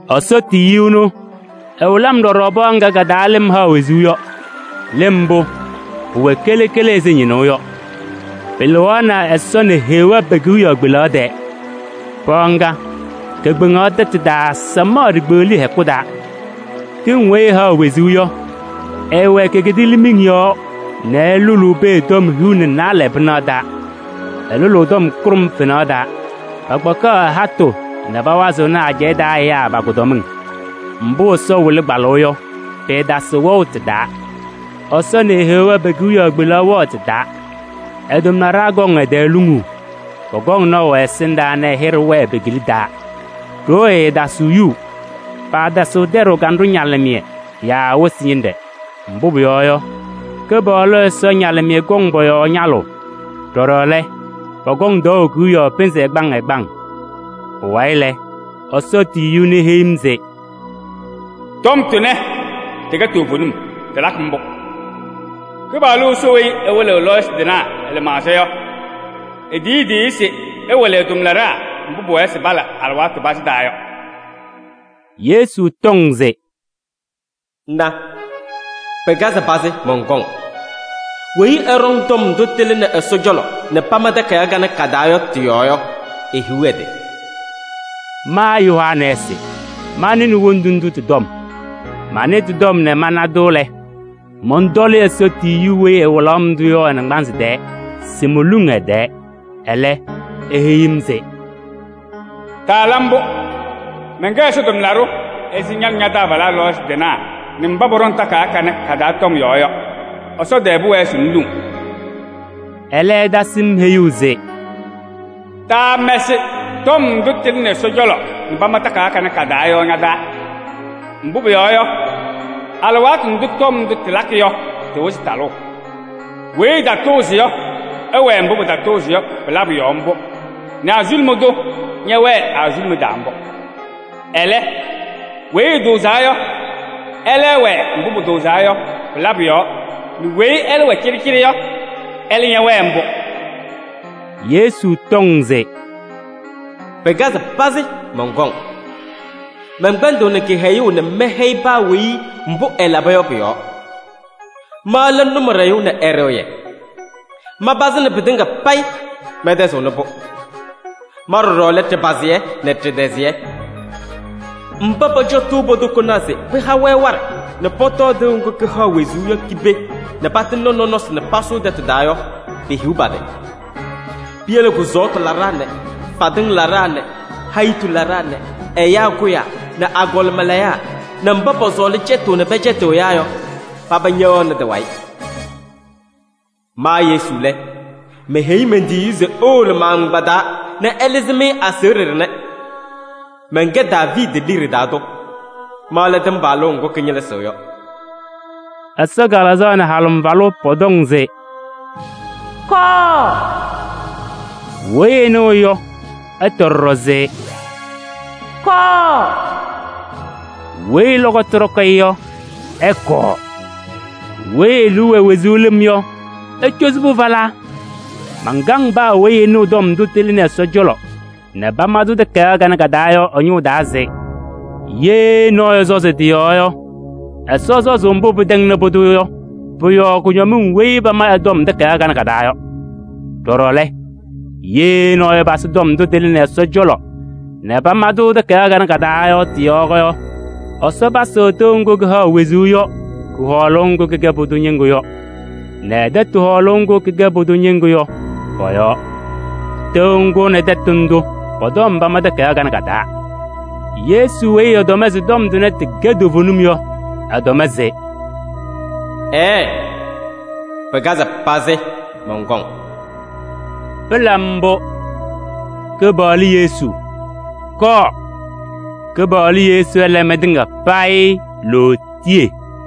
Ɛsɔ tiyiyu ɛnʋ, ɛwɩlɩ-m ɖɔɖɔ pɔɔ ŋga ka-taa lɩm haɣ wezuu yɔ. Lɩm mbʋ, pʋwɛ kele kele ɛzɩ ñɩnʋʋ yɔ. Pɩlɩɣaɣnɩ Ɛsɔ nɛ Heɣa pe-kewiyaɣ kpelaɣ tɛɛ. Pɔɔ ŋga, kekpeŋaɣ tɛtʋ taa samaɣ ɖikpeɣliye hɛkʋ taa. Tɩŋ weyi ɩhaɣ wezuu yɔ, ɩɩwɛ ke-kidiilimiŋ yɔɔ nɛ ɩlʋlʋʋ pee tɔm hiu nɛ naalɛ pɩnaɣ taa. Ɩlʋlʋʋ tɔm kʋɖʋm fenaɣ taa. Pakpakɩɣ ɩ-hatʋ nɛ pawazɩɣnɩ ajɛɛ taa ɛyaa pa-kʋdɔmɩŋ. Mbʋ Ɛsɔ wɩlɩ kpalʋʋ yɔ, pɩɩtasɩɣ wɛʋ tɩ-taa. Ɛsɔ nɛ Heɣa pe-kewiyaɣ kpelaɣ wɛɣ tɩ-taa. Ɛ-tʋmlaɖaa kɔŋ ɛ-tɛɛ luŋuu. Pɔkɔŋ naʋ ɛ-ɛsɩndaa nɛ ɛ-hɩɖɛ wɛɛ pe-kila taa. Ɖoo ɛɛtasɩɣ yuu. Paatasɩɣ tɛɖʋʋ kanɖʋ ñalɩmɩyɛ yaa wɩsɩ ñɩnɖɛ, mbʋ pʋyɔɔ yɔ, Kɩpaɣlʋ Ɛsɔ ñalɩmɩyɛ kɔŋ pɔ-yɔɔ ñalʋʋ. Ɖɔɖɔ lɛ, pɔkɔŋ tɔɔʋ kewiyaɣ pɩnzɩ ɛgbaŋ ɛgbaŋ. Pʋwayɩ lɛ, Ɛsɔ tiyiyu ɛnʋ, eheyi-m se: “Tɔm tʋnɛ, tɩkɛ toovenim, tɩlakɩ mbʋ. Kɩpaɣlʋ Ɛsɔ weyi ɛwɩlɩɣ lɔɔyɩsɩ tɩnaa ɛ-lɩmaɣza yɔ, etiyi e-tiyiyu se ɛwɩlɩ ɛ-tʋmlaɖaa mbʋ pʋwɛɛ se pala alɩwaatʋ pazɩ taa yɔ.” Yesu tɔŋ se: “Na, pɩkazɩ pazɩ, mɔnkɔŋ! Weyi ɛɖɔŋ tɔm ndʋ tɩlɩnɩ Ɛsɔ cɔlɔ nɛ pama takayaɣ kanɛ ka-taa yɔ tɩ-yɔɔ yɔ, ehiɣ ɛ-tɩ!” Ma Yohanɛɛsɩ, manɩnɩ wondu ndʋ tɩ-tɔm. Manɩ tɩ-tɔm nɛ mana-tʋ lɛ, mɔntɔlɩ Ɛsɔ tiyiyu weyi ɛwɩlaɣ-m-tʋ yɔ ɛ-naŋgbanzɩ tɛɛ se moluŋ ɛ-tɛɛ. Ɛlɛ, eheyi-m se: “Taala mbʋ! Mɛnkɛ Ɛsɔ tʋmlaɖʋ ɛzɩ ña nɛ ña-taabalaa lɔɔyɩsɩ tɩnaa nɛ mba pɔɖɔŋ takayaɣ kanɛ ka-taa tɔm yɔɔ yɔ. Ɛsɔ tɛɛ pʋwɛɛ se ŋluŋ!” Ɛlɛ ɛtasɩ-m heyuu se: “Taamɛsɩ tɔm ndʋ tɩlɩnɩ Ɛsɔ cɔlɔ nɛ pama takayaɣ kanɛ ka-taa yɔ ña-taa. Mbʋ pʋyɔɔ yɔ, alɩwaatʋ ndʋ tɔm ndʋ tɩlakɩ yɔ, tɩwɩzɩ talʋʋ. Weyi ɛtatʋʋzɩ yɔ, ɛwɛɛ mbʋ pɩtatʋʋzɩ yɔ pɩ-labʋ yɔɔ mbʋ nɛ azuluma tʋ ñɛwɛɛ ɛ-azuluma taa mbʋ. Ɛlɛ, weyi ɛtʋʋzaa yɔ, ɛlɛ ɛwɛɛ mbʋ pʋtʋʋzaa yɔ pɩ-labʋ yɔɔ nɛ weyi ɛlɛ wɛ cɩɖɩcɩɖɩ yɔ, ɛlɛ ñɛwɛɛ mbʋ!” Yesu tɔŋ se: “Na! Pɩkazɩ pazɩ, mɔnkɔŋ! Mɛnkpɛnɖɩɣnɩ kɩhɛyʋʋ nɛ mɛhɛyɩ paa weyi mbʋ ɛlaba yɔ pʋ-yɔɔ. Ma lɛ Nʋmɔɖɛyʋ nɛ Ɛɖɩɣyɛ, manpazɩnɩ pɩtɩŋa payɩ, mɛntɛzɩɣnɩ-pʋ. Ma ɖɔɖɔ lɛ Ɖɩpazɩyɛ nɛ Ɖɩtɛzɩyɛ. Mba pɔcɔtʋʋ po-tokonaa se pɩha-wɛ waɖɛ nɛ pɔtɔɔ tɩʋ ŋgʋ kɩhaɣ wezuu yɔ ki-pee nɛ patɩŋnɩ nɔnɔsɩ nɛ pasʋʋ tɛtʋ taa yɔ, pehiɣ pa-tɩ! Piyele kʋsɔɔtʋ laɖaa nɛ fadɩŋ laɖaa nɛ hayitu laɖaa nɛ ɛyaa kʋyaa nɛ agɔlɩma layaa nɛ mba pɔsɔɔlɩ cɛtʋʋ nɛ pɛcɛtɩɣ ɛyaa yɔ, paba ñɛwɛɣnɩ tɩ-wayɩ! Ma Yesu lɛ, meheyi men-tiyiyu se ewolo ma-agbaa taa nɛ ɛlɩzɩ-mɩ aseɣɖe ɖɩnɛ. Mɛnkɛ Daaviidi liɖe taa tʋ, ma lɛ tɩmbalʋʋ ŋgʋ kɩñɩlɩzɩɣ yɔ.” Ɛsɔ Kalɩzaɣ nɛ Halɩmvalʋ pɔtɔŋ se: “Kɔɔ!” Weyi ɛnɩɣ yɔ, ɛtɔ ɖɔɖɔ se: “Kɔɔ!” Weyi lɔkɔtʋ ɖɔkɩ-ɩ yɔ, ɛkɔɔ: weyi e-liu wɛ wezuu lɩm yɔ, ecozi-pʋ falaa! Mankaŋ paa weyi ɛnɩɣ tɔm ndʋ tɩlɩnɩ Ɛsɔ cɔlɔ nɛ pama-tʋ takayaɣ kanɛ ka-taa yɔ ɛ-ñʋʋ taa se: ye nɔɔyʋ ɛsɔzɩ tɩ-yɔɔ yɔ, Ɛsɔ sɔzʋʋ mbʋ pɩtɛŋnɩ pʋdʋ yɔ pʋ-yɔɔ kʋñɔmɩŋ weyi pama ɩ-tɔm takayaɣ kanɛ ka-taa yɔ. Ɖɔɖɔ lɛ, ye nɔɔyʋ ɛpasɩ tɔm ndʋ tɩlɩnɩ Ɛsɔ cɔlɔ nɛ pama-tʋ takayaɣ kanɛ ka-taa yɔ tɩ-yɔɔ yɔ, Ɛsɔ pasɩɣ tɩʋ ŋgʋ kɩhaɣ wezuu yɔ kʋ-hɔɔlʋʋ ŋgʋ kɩkɛ pʋdʋ ñɩŋgʋ yɔ nɛ ɛ-tɛtʋ hɔɔlʋʋ ŋgʋ kɩkɛ pʋdʋ ñɩŋgʋ yɔ pɔ-yɔɔ. Tɩʋ ŋgʋ nɛ tɛtʋ ndʋ pɔ-tɔm pama takayaɣ kanɛ ka-taa. Yesu weyi ɛtɔm se tɔm tʋnɛ tɩkɛ toovenim yɔ, ɛtɔm se: “Ɛɛ, pɩkazɩ pazɩ, mɔnkɔŋ.” Pɩla mbʋ! Kɩpaɣlʋ Yesu, kɔɔ! Kɩpaɣlʋ Yesu ɛla mɩtɩŋa payɩ lootiye!